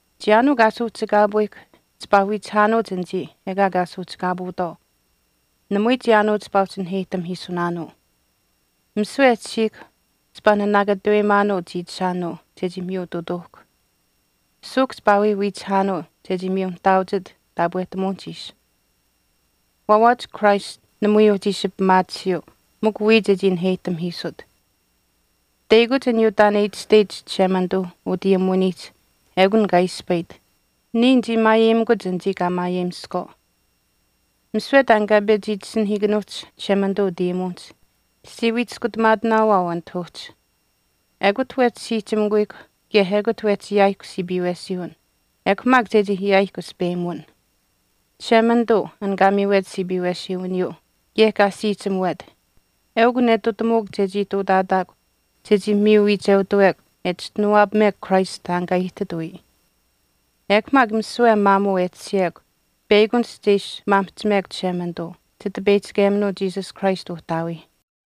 Chiyaanuu kaa suuhchikaapuuyihkw chipaa wiichihaanuuch anichii ekaa kaa suuhchikaapuutwaau. Namui chiyaanuu chipaa uhchi wii naheyihtamihiisunaanuu. Misiwe e tashiihkw chipaa nanaakatuweyimaanuu chiichishaanuu chechii miyutuutuuhkw. Suuhk chipaa wii wiichihaanuu chechii nihtaauchit taapwehtamuwinihch ishi. Waawaach Christ namui uhchi ishi pimaatisiyuu mikw wiya chechii naheyihtamihiisut. Teyakuch aniyuu taan e itashteyich Chishemanituu utayimuwinihch ekun kaa ispayit, “Niya nichii maayeyimikuch anichii kaa maayeyimiskwaau.” Misiwe taan kaa pechi itasinahiikanuuhch Chishemanituu utayimuwinihch chichii wii chiskutamaakunaanuu anit uhchi. Ekut wehchi siihchimikuyihkw kaye ekut wehchi ayaayihkw siipiiwesiiwin ekw maak chechii ayaayihkw aspeyimuwin. Chishemanituu an kaa miiwet siipiiwesiiwiniyuu kaye kaa siihchimuwet eukw netutamuuk chechii ihtuutaataakw chechii miyu wiicheutuwekw e chischinuwaapamekw Christ taan kaa aihtit wiya. Ekw maak misiwe maamuu e tashiyekw peyakunihch che ishi maamihchimekw Chishemanituu, Chitipeyihchikeminuu Jesus Christ Uhtaawii.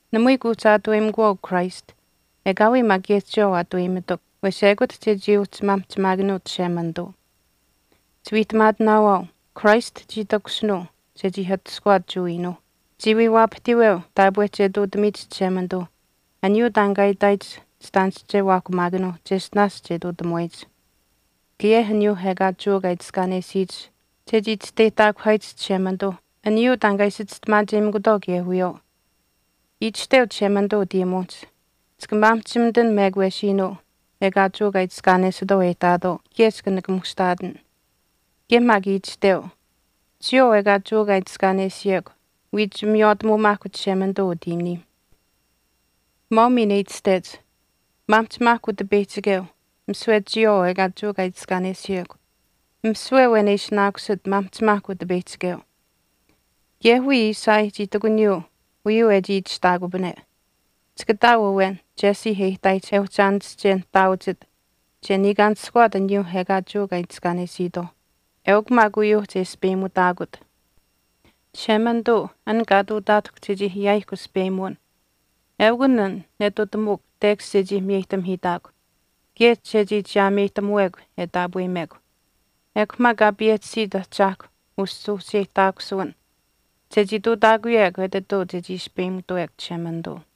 Namui kuuhchi aatuweyimikuwaau Christ, ekaawii maak kaye chiyawaau aatuweyimitukw wes ekut chechii uhchi maamihchimaakanuut Chishemanituu. Chiwiihtamaatinaawaau, Christ chii takushinuu chechii atushkuwaat Jewa iinuuh, chii wii waapahtiiweu taapwe che ihtuutamiyich Chishemanituuh aniyuu taan kaa itaayich chitaanische waahkumaakanuuh cheshtinaash che ihtuutamuwaayich. Kaye maak chii takushinuu kaye aniyuuh ekaa Jewa kaa itiskaanesiyich chechii chisteyihtaakuhaayich Chishemanituu aniyuu taan kaa ishi chistimaacheyimikutwaau kaye wiyawaau. Itashteu Chishemanituu utayimuwinihch, Chika maamihchimitin mekwesiinuu ekaa Jewa kaa itiskaanesitwaau e ihtaatwaau kaye chika nikamuushtaatin. Kaye maak itashteu, Chiyawaau ekaa Jewa kaa itiskaanesiyekw wiich miywaatamuumaahkw Chishemanituu utiiniim. Maau miin e itashtech, Maamihchimaahkw Utipeyihchikeu misiwe chiyawaau ekaa Jewa kaa itiskaanesiyekw. Misiwe awen e ishinaakusit, maamihchimaahkw Utipeyihchikeu. Kaye wiya Isaiah chii ihtakuniyuu uyuu e chii itashtaakupane, Chika ihtaau awen Jesse e ihtaayich e uhchi aanische nihtaauchit che niikaanishkuwaat aniyuu ekaa Jewa kaa itiskaanesiitwaauh. Eukw maak uyuuh che aspeyimutaakut. Chishemanituu, an kaa ihtuutaatahkw chechii ayaayihkw aspeyimuwin eukun an netutamuuk tekash chechii miyeyihtamihiitaakw kaye chechii chiyaameyihtamuwekw e taapweyimekw. Ekw maak Kaa payehchisit Ahchaahkw usuuhcheyihtaakusuwin chechii ihtuutaakuyekw etituu chechii aspeyimitutawekw Chishemanituu.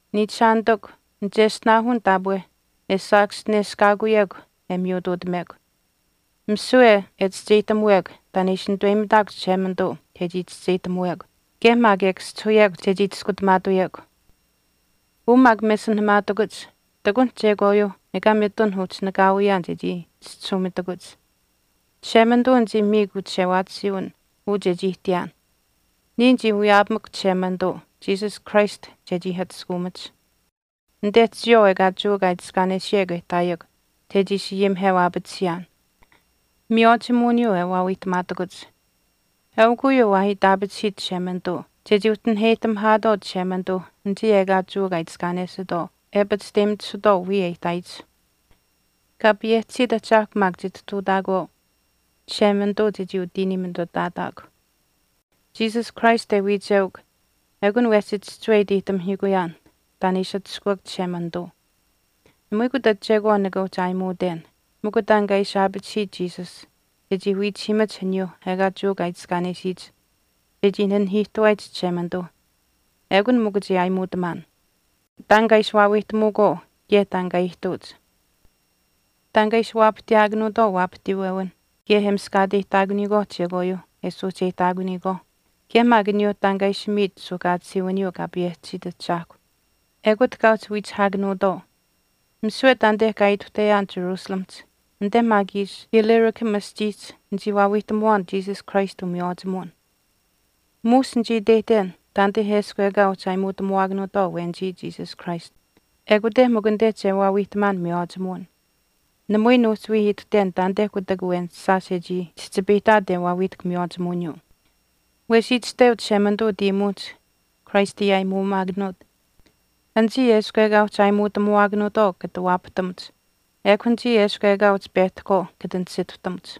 Niichishaanitikw, nicheshtinaahun taapwe e Saakaschineshkaakuyekw e wii miyutuutamekw, misiwe e chischeyihtamuwekw taan e ishi nituweyimitaakw Chishemanituu chechii chischeyihtamuwekw kaye maak e kaschihuyekw chechii chiskutamaatuyekw. Uu maak mesinahamaatakuch ihtakunh chekwaayuuh ekaa mitun uhchi nakaawiyaan chechii chischisuumitakuch. Chishemanituu nichii miikw uchishewaatisiiwin uu chechii ihtiyaan. Niya nichii wiyaapamukw Chishemanituu Jesus Christ chechii atushkaamach, anite chiyawaau ekaa Jewa kaa itiskaanesiyekw e ihtaayekw chechii ishi ayimiheu aapatisiyaan, miywaachimuwiniyuu e waawiihtamaatakuch. Eukw uyuu waa itaapachihiit Chishemanituu chechii uhchi naheyihtamihaatwaau Chishemanituuh anichii ekaa Jewa kaa itiskaanesitwaau e pachishteyimitisuutwaau wiya e ihtaayich. Kaa payehchisiit Ahchaahkw maak chitihtuutaakuwaau Chishemanituu chechii utiiniimitutaataakw. Jesus Christ e wiichewak ekun wehchi chihchiwe iteyihtamihiikuyaan taan e ishi atushkuuk Chishemanituu. Namui kutach chekwaan nika uhchi aayimuuten, mikw taan kaa ishi aapachihiit Jesus chechii wiichihiimach aniyuuh ekaa Jewa kaa itiskaanesiyich chechii nanihiihtuwaayich Chishemanituu, ekun mikw che aayimuutamaan. Taan kaa ishi waawiihtamuukwaau kaye taan kaa ihtuuch, taan kaa ishi waapahtiyaakanuutwaau waapahtiiwewinh kaye e miskaateyihtaakuniyikwaauh chekwaayuuh e suuhcheyihtaakuniyikwaauh, kaye maak aniyuu taan kaa ishi miit suuhkaatisiiwiniyuu Kaa payehchisiit Ahchaahkw ekut kaa uhchi wiihkuchihaakanuutwaau. Misiwe taanite kaa ituhteyaan Jerusalemihch anite maak ishi Illyricum aschiihch nichii waawiihtamuwaan Jesus Christ umiywaachimuwin. Muush nichii iteyihten taanite eshkw ekaa uhchi aayimuutamuwaakanuutwaau awenichii Jesus Christ ekute mikw anite che waawiihtamaan miywaachimuwin. Namui nuhchi wii ituhten taanite kutak awen shaash e chii chihchipayihtaat e waawiihtahk miywaachimuwiniyuu. Wesh itashteu Chishemanituu utayimuwinihch Christ e aayimuumaakanuut, Anichii eshkw ekaa uhchi aayimuutamuwaakanuutwaau kata waapahtamuch, ekw anichii eshkw ekaa uhchi pehtahkwaau kata nisituhtamuch.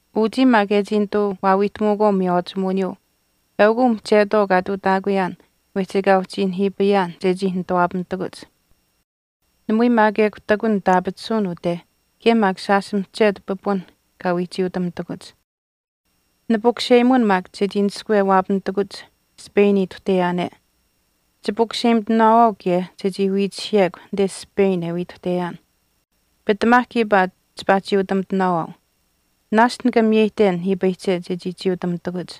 Uchii maak e chii nituu waawiihtamuukwaau miywaachimuwiniyuu eukw uu mihchetwaau kaa ihtuutaakuyaan wehchi ekaa uhchi nihiipayaan chechii nituwaapamitakuch. Namui maak ekw ihtakun nitaapatisuwin ute kaye maak shaash mihchetu pipunh kaa wii chiiutamitakuch. Nipukuseyimun maak chechii naskwe waapamitakuch Spain ituhteyaane. Chipukuseyimitinaawaau kaye chechii wiichihiyekw anite Spain e wii ituhteyaan. Pitamaa kiipaa chipaa chiiutamitinaawaau. Naashch nika miyeyihten nihiipayihche chechii chiiutamitakuch.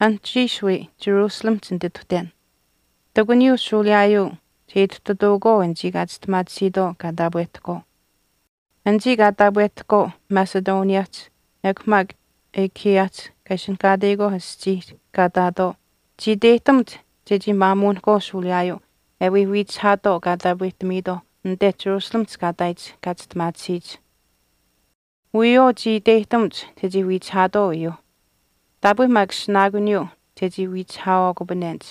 Anuhchiish wii Jerusalemihch nitituhten. Ihtakuniyuu shuuliyaayuu che ituhtatuukwaau anichii kaa chistimaatisiitwaau kaa taapwehtahkwaau. Anichii kaa taapwehtahkwaau Macedoniahch ekw maak Achaiahch kaa ishinihkaateyikwaauh aschiih kaa ihtaatwaau chii iteyihtamuch chechii maamuunihkwaau shuuliyaayuu e wii wiichihaatwaau kaa taapwehtamiitwaauh anite Jerusalemihch kaa ihtaayich kaa chistimaatisiyich. Wiyawaau chii iteyihtamuch chechii wiichihaatwaau uyuuh. Taapwe maak ishinaakuniyuu chechii wiichihaawaakupanenich.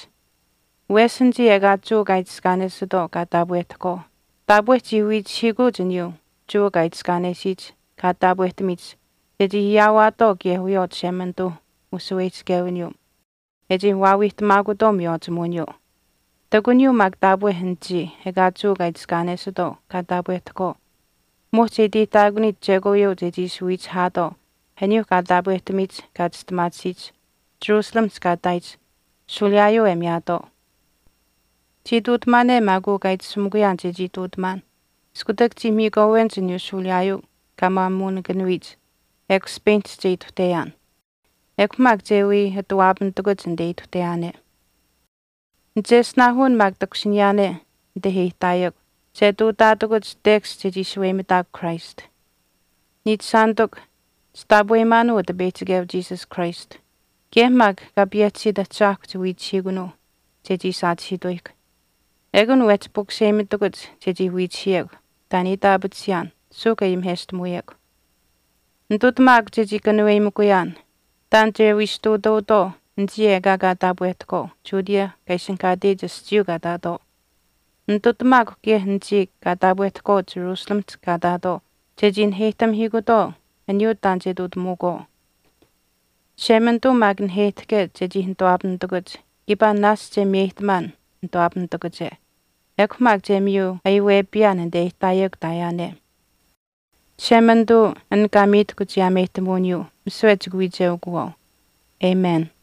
Wesh anichii ekaa Jewa kaa itiskaanesitwaau kaa taapwehtahkwaau taapwe chii wiichihiikuuch aniyuuh Jewa kaa itiskaanesiyich kaa taapwehtamiyich chechii ayaawaatwaau kaye wiyawaau Chishemanituuh ushaweyihchichewiniyuu e chii waawiihtamaakutwaau miywaachimuwiniyuu. Ihtakuniyuu maak taapwe anichii ekaa Jewa kaa itiskaanesitwaau kaa taapwehtahkwaau muhch e iteyihtaakuniyich chekwaayuu chechii ishi wiichihaatwaau aniyuuh kaa taapwehtamiyich kaa chistimaatisiyich Jerusalemihch kaa ihtaayich shuuliyaayuu e miyaatwaau. Chii ihtuutamaane maak uu kaa itashumikuyaan chechii ihtuutamaan iskutak chii miikwaawenich aniyuu shuuliyaayuu kaa maamuunikanuyich ekw Spainihch che ituhteyaan. Ekw maak che wii ati waapamitakuch anite ituhteyaane. Nicheshtinaahun maak takushiniyaane anite e ihtaayekw che ihtuutaatakuch tekash chechii shaweyimitaakw Christ. Niichishaanitikw, chitaapweyimaanuu Utipeyihchikeu Jesus Christ kaye maak Kaa payehchisiit Ahchaahkw chiwiichihiikunuu chechii saachihiituyihkw, ekun wehchi pukuseyimitakuch chechii wiichihiyekw taan e itaapatisiyaan suuhk e ayimiheshtamuyekw. Nitutamaakw chechii kanuweyimikuyaan taan che wii ishi wiyesh ihtuutuutwaau anichii ekaa kaa taapwehtahkwaau Judea kaa ishinihkaateyich aschiiyuu kaa ihtaatwaau. Nitutamaakw kaye anichii kaa taapwehtahkwaau Jerusalemihch kaa ihtaatwaau chechii naheyihtamihiikutwaau aniyuu taan che ihtuutamuukwaau. Chishemanituu maak naheyihtahke chechii nituwaapamitakuch kiipaa naashch che miyeyihtamaan nituwaapamitakuche ekw maak che miyu ayiwepiyaan anite e ihtaayekw ihtaayaane. Chishemanituu an kaa miitahkw chiyaameyihtamuwiniyuu misiwe chika wiicheukuwaau. Amen.